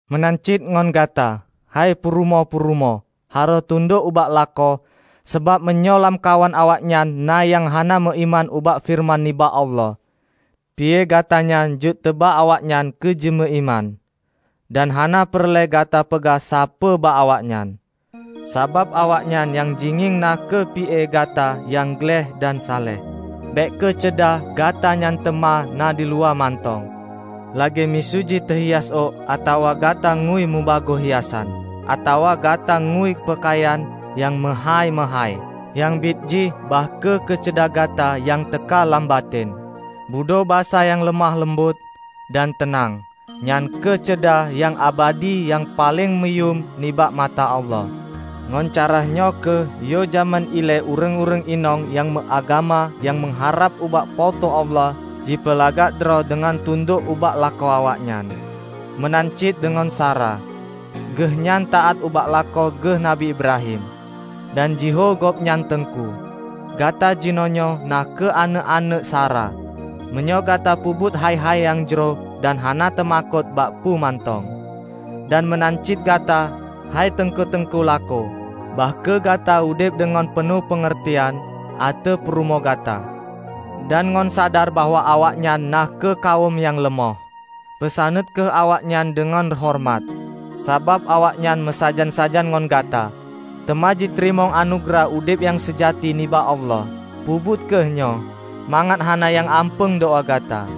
Meunan cit ngon gata, hei purumoh-purumoh, harôh tundok ubak lakoe sabab meunyoe lamkawan awaknyan na nyang hana meuiman ubak feureuman nibak Allah, pi-e gata nyan jeuet teuba awaknyan keu jimeuiman. Dan hana peureulée gata peugah sapeue bak awaknyan, sabab awaknyan nyang jingieng na kheueh pi-e gata nyang gleh dan saleh. Bék kheueh ceudah gata nyan teuma na diluwa mantong, lagée miseu jih teuhias ôk atawa gata ngui mubagoe hiasan, atawa gata ngui peukayan nyang meuhái-meuhái. Nyang biet jih, bah kheueh keuceudah gata nyan teuka lam batén, budho basa nyang leumoh leumbot dan teunang; nyan kheueh ceudah nyang abadi nyang paleng muyuem nibak mata Allah. Ngon cara nyoe kheueh yoh jamén ilée ureuëng-ureuëng inong nyang meuagama nyang meuharab ubak Po teu Allah jipeulagak droe deungon tundok ubak lakoe awaknyan. Meunan cit deungon Sara, geuhnyan taát ubak lakoe geuh Nabi Ibrahim dan jihôi gobnyan teungku. Gata jinoenyoe na kheueh aneuëk-aneuëk Sara, meunyoe gata peubuet hai-hai nyang jroh dan hana teumakot bak peue mantong. Dan meunan cit gata, hei teungku-teungku lakoe, bah kheueh gata udeb ngon peunoh peungeurtian ateueh purumoh gata, dan ngon sadar bahwa awaknyan na kheueh kawöm nyang leumoh. Peusaneut kheueh awaknyan deungon horeumat, sabab awaknyan meusajan-sajan ngon gata, teuma jiteurimong anugeurah udeb nyang seujati nibak Allah. Peubuet kheueh nyoe, mangat hana nyang ampeung doá gata.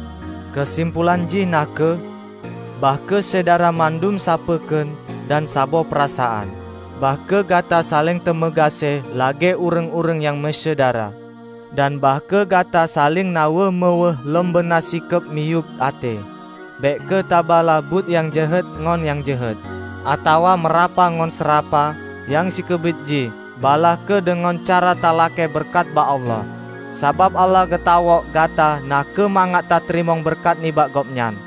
Keusimpolan jih na kheueh: bah kheueh Syedara mandum sapeue kheun dan saboh peurasaan. Bah kheueh gata saléng tameugaséh lagée ureuëng-ureuëng nyang meusyedara. Dan bah kheueh gata saléng na weueh meuweueh lom beuna sikeub miyueb até. Bék kheueh tabalaih buet nyang jeuhet ngon nyang jeuhet, atawa meurapa ngon seurapa; nyang sikeubiet jih, balaih kheueh deungon cara teulakée beureukat bak Allah. Sabab Allah geutawök gata na kheueh mangat tateurimong beureukat nibak Gobnyan.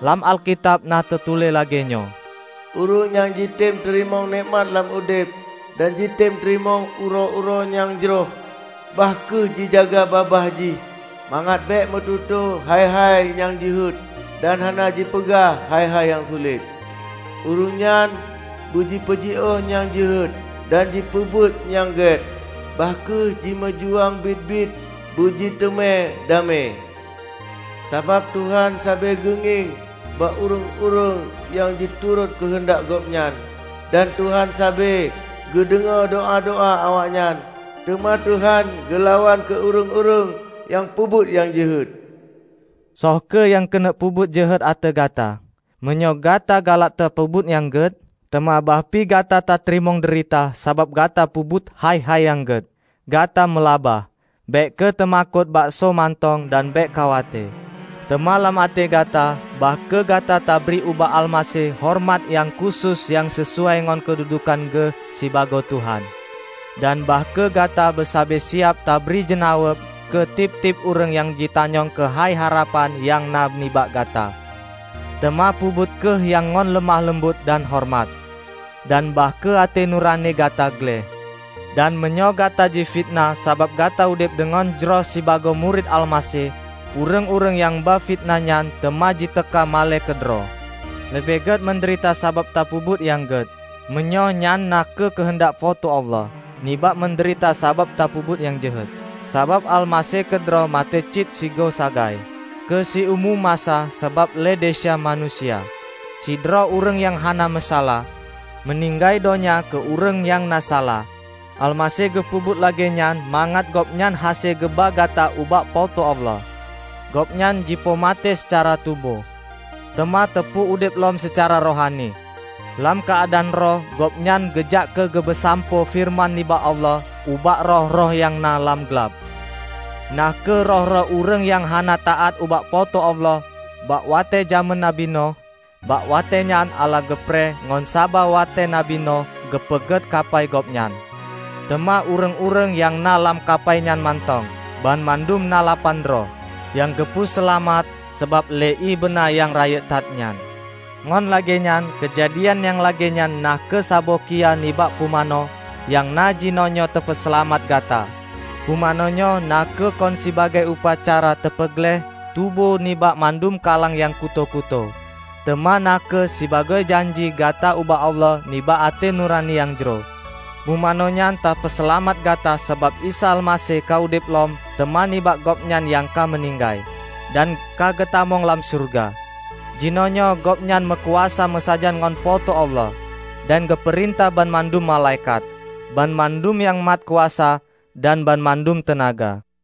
Lam Alkitab na teutuléh lagée nyoe, "Ureuëng nyang jitem teurimong nekmat lam udeb dan jitem teurimong uroe-uroe nyang jroh, bah kheueh jijaga babah jih mangat bék meututoe hai-hai nyang jeuhet dan hana jipeugah hai-hai nyang sulet. Ureuëng nyan beujipeujioh nyang jeuhet dan jipeubuet nyang gét; bah kheueh jimeujuang biet-biet beujiteumé damé. Sabab Tuhan sabe geungieng bak ureuëng-ureuëng nyang jiturot keuheundak Gobnyan, dan Tuhan sabe geudeungoe doá-doá awaknyan; teuma Tuhan geulawan keu ureuëng-ureuëng nyang peubuet nyang jeuhet." Soe kheueh nyang keuneuk peubuet jeuhet ateueh gata, meunyoe gata galak tapeubuet nyang gét? Teuma bahpi gata tateurimong deurita sabab gata peubuet hai-hai nyang gét, gata meulaba! Bék kheueh teumakot bak soe mantong dan bék khawate. Teuma lam até gata, bah kheueh gata tabri ubak Almaseh horeumat nyang khusos nyang sisuai ngon keududukan Geuh sibagoe Tuhan. Dan bah kheueh gata beusabe siab tabri jeunaweueb keu tieb-tieb ureuëng nyang jitanyong keuhai harapan nyang na nibak gata. Teuma peubuet kheueh nyan ngon leumoh leumbot dan horeumat. Dan bah kheueh até nurani gata gleh, dan meunyoe gata jifiteunah sabab gata udeb deungon jroh sibagoe murit Almaseh, ureuëng-ureuëng nyang ba fiteunah nyan teuma jiteuka malée keudroe. Leubeh gét meudeurita sabab tapeubuet nyang gét -- meunyoe nyan na kheueh keuheundak Po teu Allah -- nibak meudeurita sabab tapeubuet nyang jeuhet. Sabab Almaseh keudroe maté cit sigoe sagai, keu siumu masa sabab lé desya manusia -- sidroe ureuëng nyang hana meusalah, meuninggai donya keu ureuëng nyang na salah. Almaseh geupeubuet lagée nyan mangat Gobnyan hase geuba gata ubak Po teu Allah. Gobnyan jipoh maté seucara tuboh, teuma teupeu udeb lom seucara rohani. Lam keuadaan roh Gobnyan geujak keugeupeusampoe feureuman nibak Allah ubak roh-roh nyang na lam glab: na kheueh roh-roh ureuëng nyang hana taát ubak Po teu Allah bak watée jamén nabi Noh. Bak watée nyan Allah geupreh ngon saba watée nabi Noh geupeugét kapai gobnyan. Teuma ureuëng-ureuëng nyang na lam kapai nyan mantong -- banmandum na lapan droe -- nyang geupeu seulamat sabab lé ié beuna nyang rayeuk that nyan. Ngon lagée nyan, keujadian nyang lagée nyan na kheueh saboh kiyaih nibak pumanö nyang na jinoenyoe teupeuseulamat gata. Pumanö nyoe na kheueh kon sibagoe upacara teupeugleh tuboh nibak mandum kalang nyang kutoe-kutoe, teuma na kheueh sibagoe janji gata ubak Allah nibak até nurani nyang jroh. Pumanö nyan teupeuseulamat gata sabab Isa Almaseh ka udeb lom teuma nibak Gobnyan nyang ka meuninggai, dan ka geutamong lam syeuruga. Jinoenyoe Gobnyan meukuasa meusajan ngon Po teu Allah dan geupeurintah banmandum malaikat, banmandum nyang mat kuasa dan banmandum teunaga.